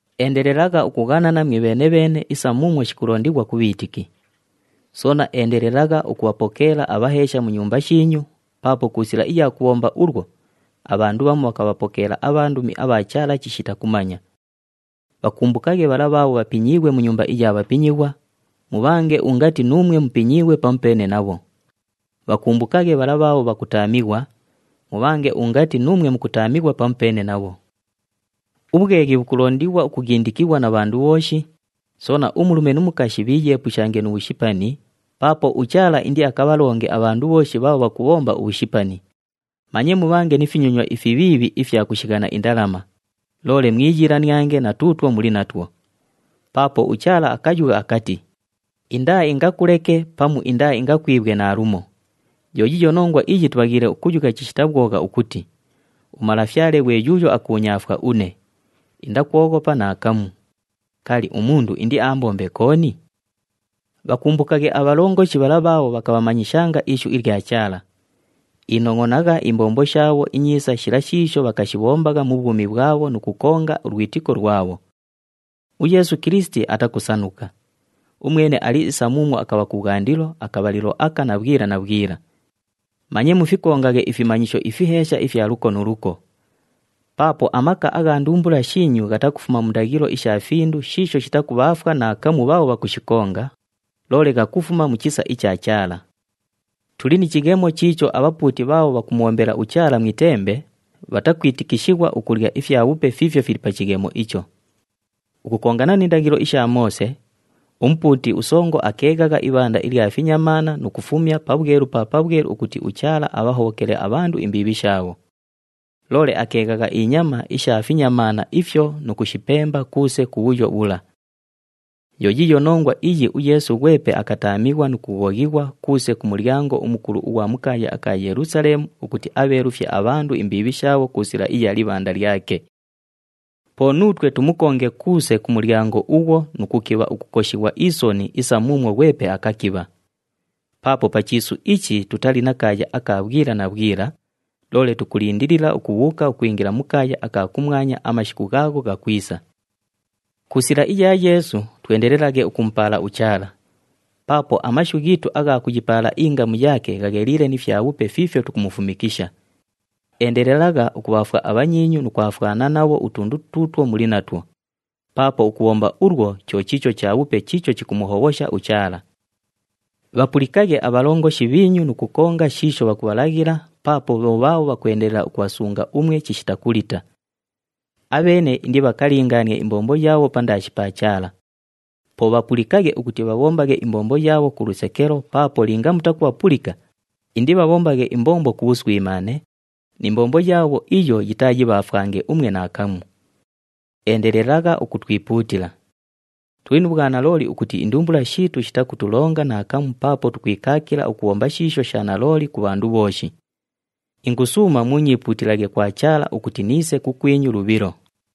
Endelelagha ukughanana mwibheene-bheene isa muumwo shikulondighwa ku bhiitiki. Soona endelelagha ukubhapokeela abhaheesha mu nyumba shiinyu, paapo ku sila iya kubhomba ulwo, abhandu bhamu bhakabhapokeela abhandumi abha Chaala chishita kumanya. Bhakumbukaghe bhala bhaabho bhapinyiighwe mu nyumba iya bhapinyighwa, mubhange ungati nuumwe mupinyiighwe pamupeene nabho. Bhakumbukaghe bhala bhaabho bhakutaamighwa, mubhange ungati nuumwe mukutaamighwa pamupeene nabho. Ubhweghi bhukulondighwa ukughindikighwa na bhandu bhooshi, soona umulume nu mukashi bhiiyeepushange nu bhushipani paapo uChaala indiakabhalonge abhandu bhooshi bhaabho bhakubhomba ubhushipani. Manye mubhange ni finyonywa ifibhiibhi ifya kushighana indalama, loole mwiyiilaniange na tuutwo muli natwo. Paapo uChaala akayugha akati, “Indaaingakuleke pamu indaaingakwibhwe naalumo.” Yo yiiyo nongwa iyi tubhaghiile ukuyugha chishita bhwogha ukuti, “UMalafyale ghwe yuuyo akuunyaafwa une, indakwoghopa naakamu. Kali, umundu indiaambombe kooni?” Bhakumbukaghe abhalongoshi bhala bhaabho bhakabhamanyishanga ishu ilya Chaala. Inongʼonagha imbombo shaabho inyiisa shila shiisho bhakashibhombagha mu bhwumi bhwabho nu kukonga ulwitiko lwabho. UYeesu Kilisiti atakusanuka. Umwene ali isa muumwo akabha kubhwandilo, akabhalilo aka na bhwila na bhwila. Manye mufikongaghe ifimanyisho ifiheesha ifya luko nu luko. Paapo amaka agha ndumbula shiinyu ghatakufuma mu ndaghilo isha findu shiisho shitakubhaafwa naakamu bhaabho bhakushikonga, loole ghakufuma mu chisa icha Chaala. Tuli ni chighemo chiicho abhapuuti bhaabho bhakumubhombela uChaala mu itembe, bhatakwitikishighwa ukulya ifyabhupe fiifyo fili pa chighemo icho. Ukukongana ni ndaghilo isha Moose, umupuuti usongo akeeghagha ibhanda ilya finyamaana nu kufumya Pabhwelu pa Pabhwelu ukuti uChaala abhahobhokele abhandu imbiibhi shaabho. Loole akeeghagha inyama isha finyamaana ifyo nu kushipemba kuuse ku bhuyo bhula. Yo yiiyo nongwa iyi uYeesu ghwepe akataamighwa nu kughoghighwa kuuse ku mulyango umukulu ughwa mu kaaya aka Yelusaleemu, ukuti abheelufye abhandu imbiibhi shaabho ku sila iya libhanda lyake. Po nuutwe tumukonge kuuse ku mulyango ughwo nu kukibha ukukoshighwa isoni isa muumwo ghwepe akakibha. Paapo pa chiisu ichi tutali na kaaya aka bhwila na bhwila, loole tukulindilila ukubhuuka ukwingila mu kaaya aka kumwanya amashiku ghaagho ghakwisa. Ku sila iya Yeesu, twendelelaghe ukumupaala uChaala. Paapo amashu ghiitu agha kuyipaala ingamu yaake ghagheliile ni fyabhupe fiifyo tukumufumishikisha. Endelelagha ukubhaafwa abhanyiinyu nu kwafwana nabho utundu tuutwo muli natwo, paapo ukubhomba ulwo, cho chiicho chabhupe chiicho chikumuhobhosha uChaala. Bhapulikaghe abhalongoshi bhiinyu nu kukonga shiisho bhakubhalaghila paapo bho bhaabho bhakwendelela ukubhasunga umwe chishita kulita. Abheene indibhakalingaanie imbombo yaabho pandaashi pa Chaala. Po bhapulikaghe ukuti bhabhombaghe imbombo yaabho ku lusekelo paapo linga mutakubhapulika, indibhabhombaghe imbombo ku bhuswimaane, ni mbombo yaabho iyo yitaayibhaafwange umwe naakamu. Endelelagha ukutwipuutila. Tuli nu bhwanalooli ukuti indumbula shiitu shitakutulonga naakamu paapo tukwikaakila ukubhomba shiisho sha nalooli ku bhandu bhooshi. Ingusuuma muunyiipuutilaghe kwa Chaala ukuti niise kukwinyu lubhilo.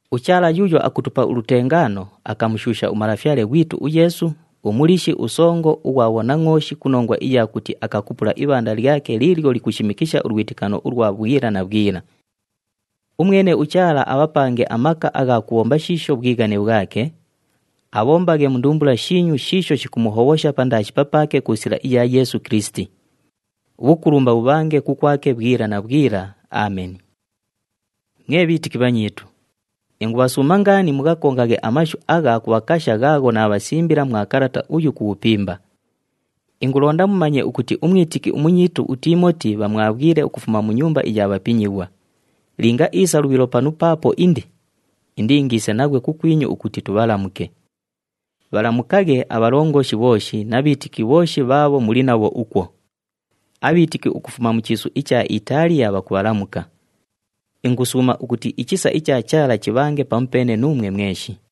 UChaala yuuyo akutupa ulutengaano akamushuusha uMalafyale ghwitu uYeesu, uMuliishi uSongo ughwa bhonangʼooshi ku nongwa iya kuti akakupula ibhanda lyake liilyo likushimikisha ulwitikano ulwa bhwila na bhwila. Umwene uChaala abhapange amaka agha kubhomba shiisho bhwighane bhwake, abhombaghe mu ndumbula shiinyu shiisho shikumuhobhosha pandaashi papaake ku sila iya Yeesu Kilisiti. Ubhukulumba bhubhange kukwake bhwila na bhwila. Ameni. Mwe bhiitiki bhanyiitu, ingubhasuuma ngaani mughakongaghe amashu agha kubhakasha ghaagho naabhasimbila mwa kalata uyu ku bhupimba. Ingulonda mumanye ukuti umwitiki umunyiitu uTiimoti bhamwabhwile ukufuma mu nyumba iya bhapinyighwa. Linga iisa lubhilo panu paapo indi, indiingiise naghwe kukwinyu ukuti tubhalamuke. Bhalamukaghe abhalongoshi bhooshi na bhiitiki bhooshi bhaabho muli nabho ukwo. Abhiitiki ukufuma mu chiisu icha Itaaliya bhakubhalamuka. Ingusuuma ukuti ichisa icha Chaala chibhange pamupeene nuumwe mweshi.